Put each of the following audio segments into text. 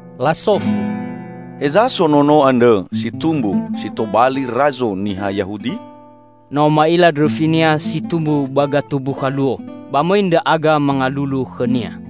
Lasofu, "Heza so Nono andrõ, si tumbu si tobali Razo niha Yahudi? No ma'ila ndrõfi-Nia si tumbu ba gatumbukha luo. Ba mõi ndra'aga mangalulu khõ-Nia."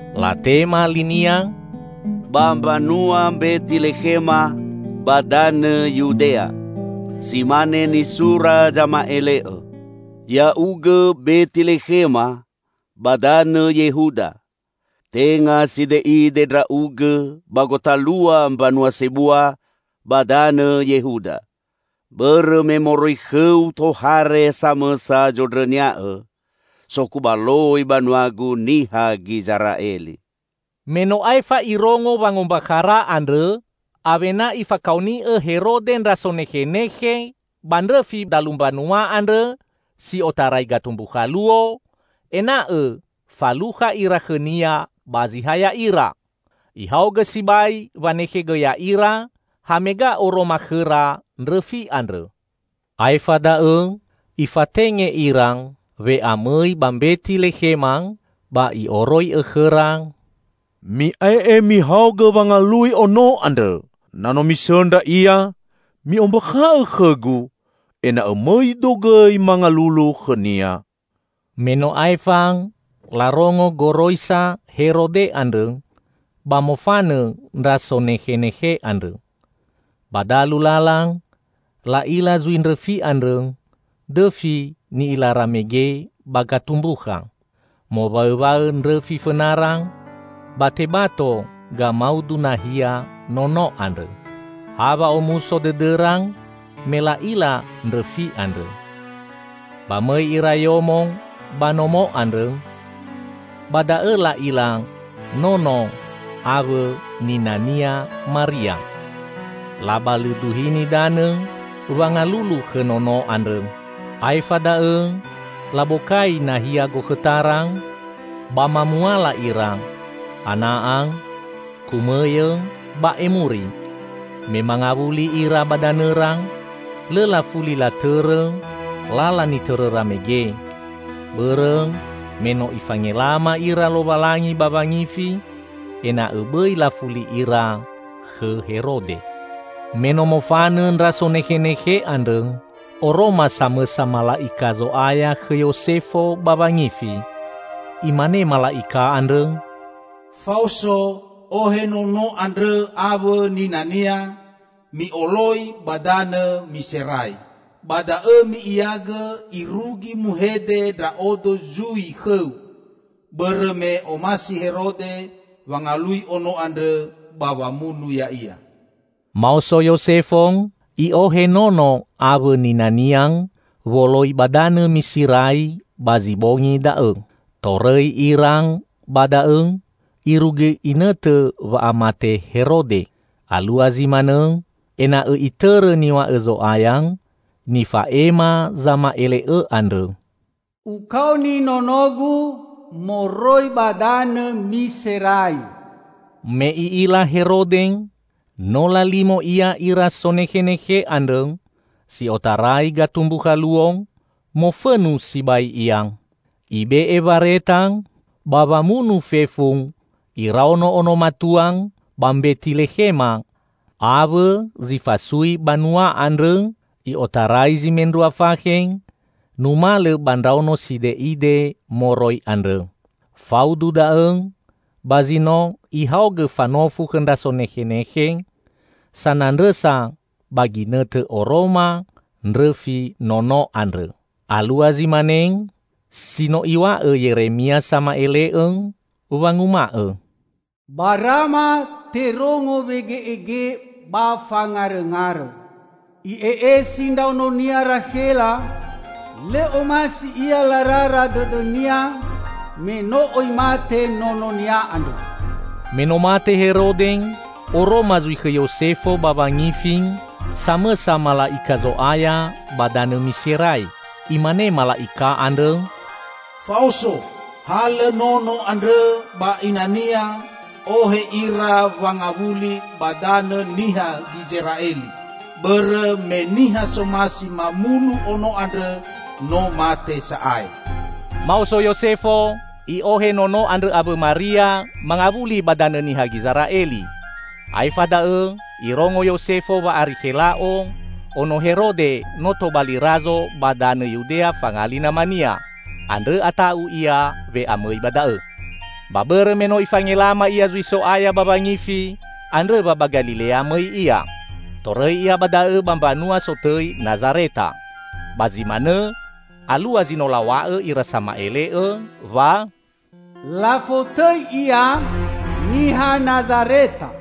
Latema linia, "Ba mbanua Mbetilekhema ba danõ Yudea. Si mane nisura zama'ele'õ. 'Ya'ugõ Betilekhema, ba danõ Yehuda, tenga side'ide ndra'ugõ ba gotalua mbanua sebua ba danõ Yehuda. Bõrõ me moroi khõu tohare samõsa zondrõnia'õ, sokubaloi banua-Gu niha Gizera'eli.'" Me no aefa irongo wangombakhara andrõ, awena ifakaoni'o Herode ndra sonekhenekhe ba ndrõfi dalu mbanua andrõ si otarai gatumbukha luo, ena'õ falukha ira khõnia ba zi ha ya'ira. Ihaogõ sibai wanekhegõ ya'ira hamega oroma khõra ndrõfi andrõ. Aefa da'õ ifatenge ira we'amõi ba Mbetilekhema, ba i'oroi'õ khõra, "Mi'ae'e mihaogõ wangalui Ono andrõ. Na no misõndra Ia, mi'ombakha'õ khõgu, ena'õ mõido gõi mangalulu khõ-Nia." Me no aefa larongo goroisa Herode andrõ ba mofanõ ndra sonekhenekhe andrõ. Ba dalu lala, la'ila zui ndrõfi andrõ, dõfi ni'ilara mege ba gatumbukha. Mowaõwaõ ndrõfi fõnara, ba tebato gamaudu nahia Nono andrõ. Ha wa'omuso dõdõra me la'ila ndrõfi andrõ! Ba mõi ira yomo ba nomo andrõ. Ba da'õ la'ila Nono awõ nina-Nia, Maria. Labalõduhini danõ wangalulu khõ Nono andrõ. Aefa da'õ labokai nahia gokhõtara, ba mamuala ira: ana'a, kumõyõ ba emuri. Me mangawuli ira ba danõra, lõ lafuli latõrõ lala nitõrõra mege, bõrõ me no Ifangelama ira Lowalangi ba wangifi ena'õ bõi lafuli ira khõ Herode. Me no mofanõ ndra sonekhenekhe andrõ, oroma samõsa mala'ika Zo'aya khõ Yosefo ba wangifi. Imane mala'ika andrõ, "Faoso, ohe Nono andrõ awõ nina-Nia, mi'oloi ba danõ Miserai. Ba da'õ mi'iagõ irugi muhede Ndra'odo zui khõu bõrõ me omasi Herode wangalui Ono andrõ ba wamunu Ya'ia." Maoso Yosefo, i'ohe Nono awõ nina-Nia woloi ba danõ Miserai, ba zi bongi da'õ. Torõi ira ba da'õ irugi inõtõ wa'amate Herode. Alua zi manõ ena'õ itõrõ niw̃a'õ Zo'aya, nifa'ema zama'ele'õ andrõ, "Ukaoni nono-Gu moroi ba danõ Miserai." Me i'ila Herode no lalimo ia ira sonekhenekhe andrõ si otarai gatumbukha luo, mofõnu sibai ia. Ibe'e wareta ba wamunu fefu iraono ono matua ba Mbetilekhema awõ zi fasui banua andrõ i'otarai zi mendrua fakhe numalõ ba ndraono side'ide moroi andrõ. Faudu da'õ ba zi no ihaogõ fanofu khõ ndra sonekhenekhe sanandrõsa ba ginõtõ oroma ndrõfi Nono andrõ. Alua zi mane si no iw̃a'õ Yeremia sama'ele'õ, wanguma'õ, "Ba Rama terongo wege'ege, ba fangarõngarõ. I'e'esi ndraonia Rakhela, lõ omasi ia larara dõdõnia, me no oi mate nononia andrõ." Me no mate Herode, oroma zui khõ Yosefo ba wangifi samõsa mala'ika Zo'aya ba danõ Miserai. Imane mala'ika andrõ, "Faoso! Halõ Nono andrõ ba ina-Nia ohe ira wangawuli ba danõ niha Gizera'eli, bõrõ me niha somasi mamunu Ono andrõ no mate sa'ae." Maoso Yosefo, i'ohe Nono andrõ awõ Maria mangawuli ba danõ niha Gizera'eli. Aefa da'õ irongo Yosefo wa Arikhela'o, ono Herode no tobali Razo ba danõ Yudea fangali namania. Andrõ ata'u ia we'amõi ba da'õ. Ba bõrõ me no Ifangelama ia zui So'aya ba wangifi, andrõ wa ba Galilea mõi ia. Torõi ia ba da'õ ba mbanua sotõi Nazareta. Ba zi manõ alua zi no law̃a'õ ira sama'ele'õ wa: "Lafotõi Ia Niha Nazareta."